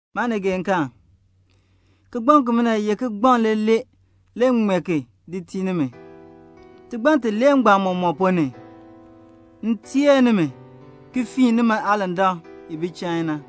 Maanigeekaan, kigbaŋ kimina ye kigbaŋ leeler le m ki ŋmee ki di tii nimi. Tigbann tilee mɔmɔk ponn ni, le m teer nimi, ki fiin nimi aalandak i bi chain na.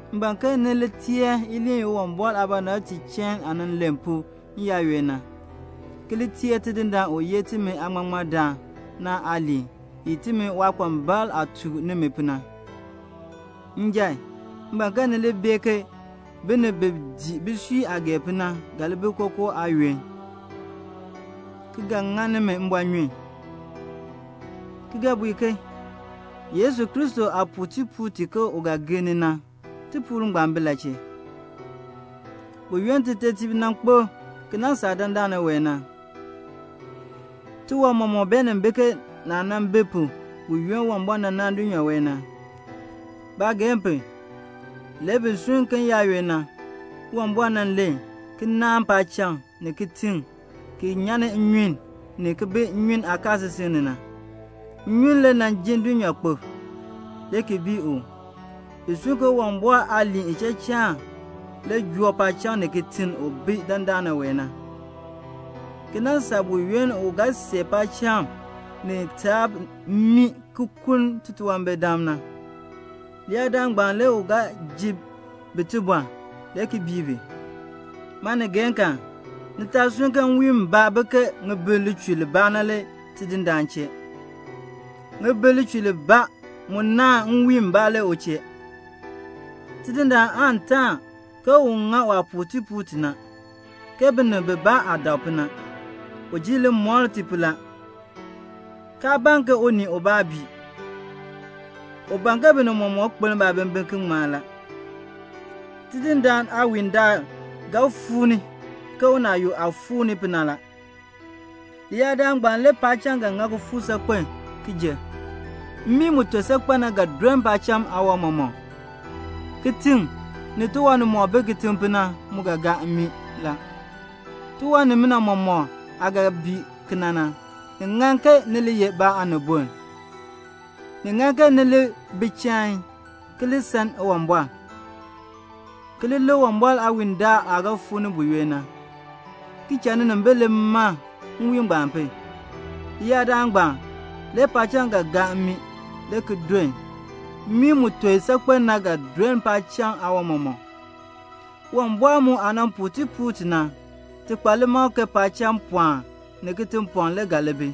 M ban ke ni li teer iliin i Uwumbɔr aabɔnabtiib chain aah nan len pu n-yaayoonn na, ki li teer Tidindaan u ye timi Aaŋmaŋmardaan na aaliin i timi waakpambalb aah tuk nimi pu na. Njan, m ban ke ni li bee ke binib bi dii bisui aah ban pu na ga li bi kookoo aayoonn, ki ga ŋa nimi mbɔɔnyun, ki ga bui ke "Yesu Kristo aah puu tipuul ti ke u ga gir ni na, tipuul ngbaan bi la chee? Buyoonn titetiib nan kpo ki nan saa dandana wee na, tiwan mɔmɔk beenin bi ke naah nan bi pu buyoonn Uwumbɔr naan dulnyaa wee na." Baageehn pu, le bi sunn ke n-yaayoonn na, Uwumbɔr nan len ki naan paacham, ni kitiŋ ki nyan ni nnyun ni ki bi nnyun aakaasisik ni na. Nnyun le nan jin dulnyaakpok, le ki bii u. Bi sunn ke Uwumbɔr aaliin ichachaan le joo paacham ni kitiŋ u bi dandana wee na, ki nan saa buyoonn u ga see paacham ni taab mmii ki kuln titunwambirdam na; leyaadaal ngbaan le u ga ji bi tibɔr le ki bii bi. Maanigeekaan, ni taa sunn ke nwiin mbaa naahn ŋibin lichur libaa la, le Tidindaan chee. Ŋibin lichur libaa mu naahn nwiin mbaa la, le u chee. Tidindaan aan yoon ke un ŋa waah puu tipuul ti na, ke binib bibaa aah dak pu na. U ji limɔr ni pu la, kaa ban ke unii ubaa bii. U ban ke binib mɔmɔk kpeln baabimbin ki ŋmar. Tidindaan aawiindaal ga fuu ni ke unaayuk aah fuu ni pu na la. Leyaadaal ngbaan le paacham ga ŋa kifuuk saakpen ki jer. Mmii mu ton saakpen na ga doln paacham aawan mɔmɔk. Kitiŋ, ni tiwan nimɔk bi kitiŋ na mu ga gaa mmii la. Tiwan nimina mɔmɔk aah ga bii kena na, ni ŋan ke ni li ye ba aaniboln? Ni ŋan ke ni li bi chain, ki san Uwumbɔr, ki li lik Uwumbɔr aawiindaal aah ga fuu ni buyoonn na, ki cha ninimbil li man nwiin ngbaan pu. Leyaadaal ngbaan, le paacham ga gaa mmii, le ki doln. Mmii mu ton saakpen na ga doln paacham aawan mɔmɔk. Uwumbɔr mu aah nan puu tipuul ti na, ti kpa limakl ke paacham pɔɔn ni kitiŋ pɔɔn le ga li bi.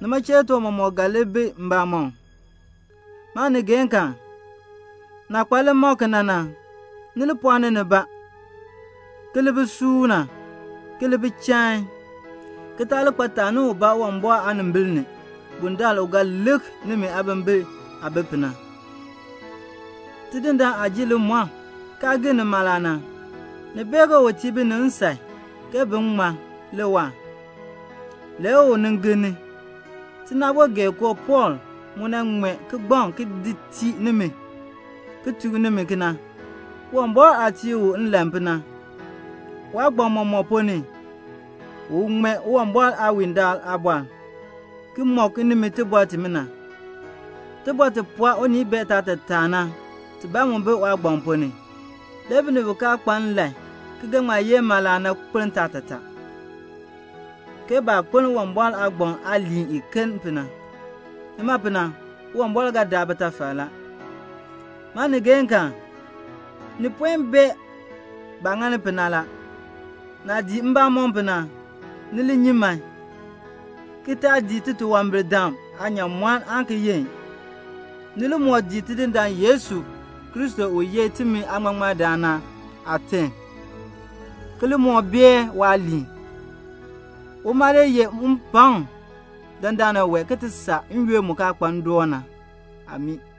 Nima chee le tiwan mɔmɔk ga li bi mbamɔm. Maanigeekaan, naah kpa limakl kena na, ni li pɔɔni nibaa ki li bi suuna, ki li bi chain, ki taa li kpa taani ubaa Uwumbɔr aanimbil ni bundaln u ga lik nimi aabimbin aah bi pu na. Tidindaan aah ji limɔr kaa gir ni mala na, ni bee ke u tii binib nsan ke bin ŋmar le waahr, le u nin gir ni. Tinaabogeekoo Pɔɔl mu nan ŋmee kigbaŋ ki di tii ni nimi, ki tuk nimi kena, Uwumbɔr aah tii u nlan pu na. Waagbann mɔmɔk ponn ni u ŋmee Uwumbɔr aawiindaal aabɔr, ki mɔk nimi tibɔr timina. Tibɔr ti pɔɔ unii bee taatataa na tibaa mu bi waagbann ponn ni. Le binib bi kaa kpa nlan ki ga ŋma yenn mala na kpeln taatataa, ke baah kpeln Uwumbɔr aagbaŋ aaliin iken pu na. Nima pu na Uwumbɔr ga daa bitafal la. Maanigeekaan, ni puen bee baah ŋani pu na la. Naah dii mbamɔm pu na, ni li nyi man, ki taa dii titunwambirdam aanyaamɔn aan ki yenn. Ni li moo gaa Tidindaan Yesu Kristo u ye timi Aaŋmaŋmardaan na aaterm, ki li moo bae waaliin. Uma le yeh mpakm dandana wee ki ti saa n-yoonn mu kaa kpa ndoon na. Amii.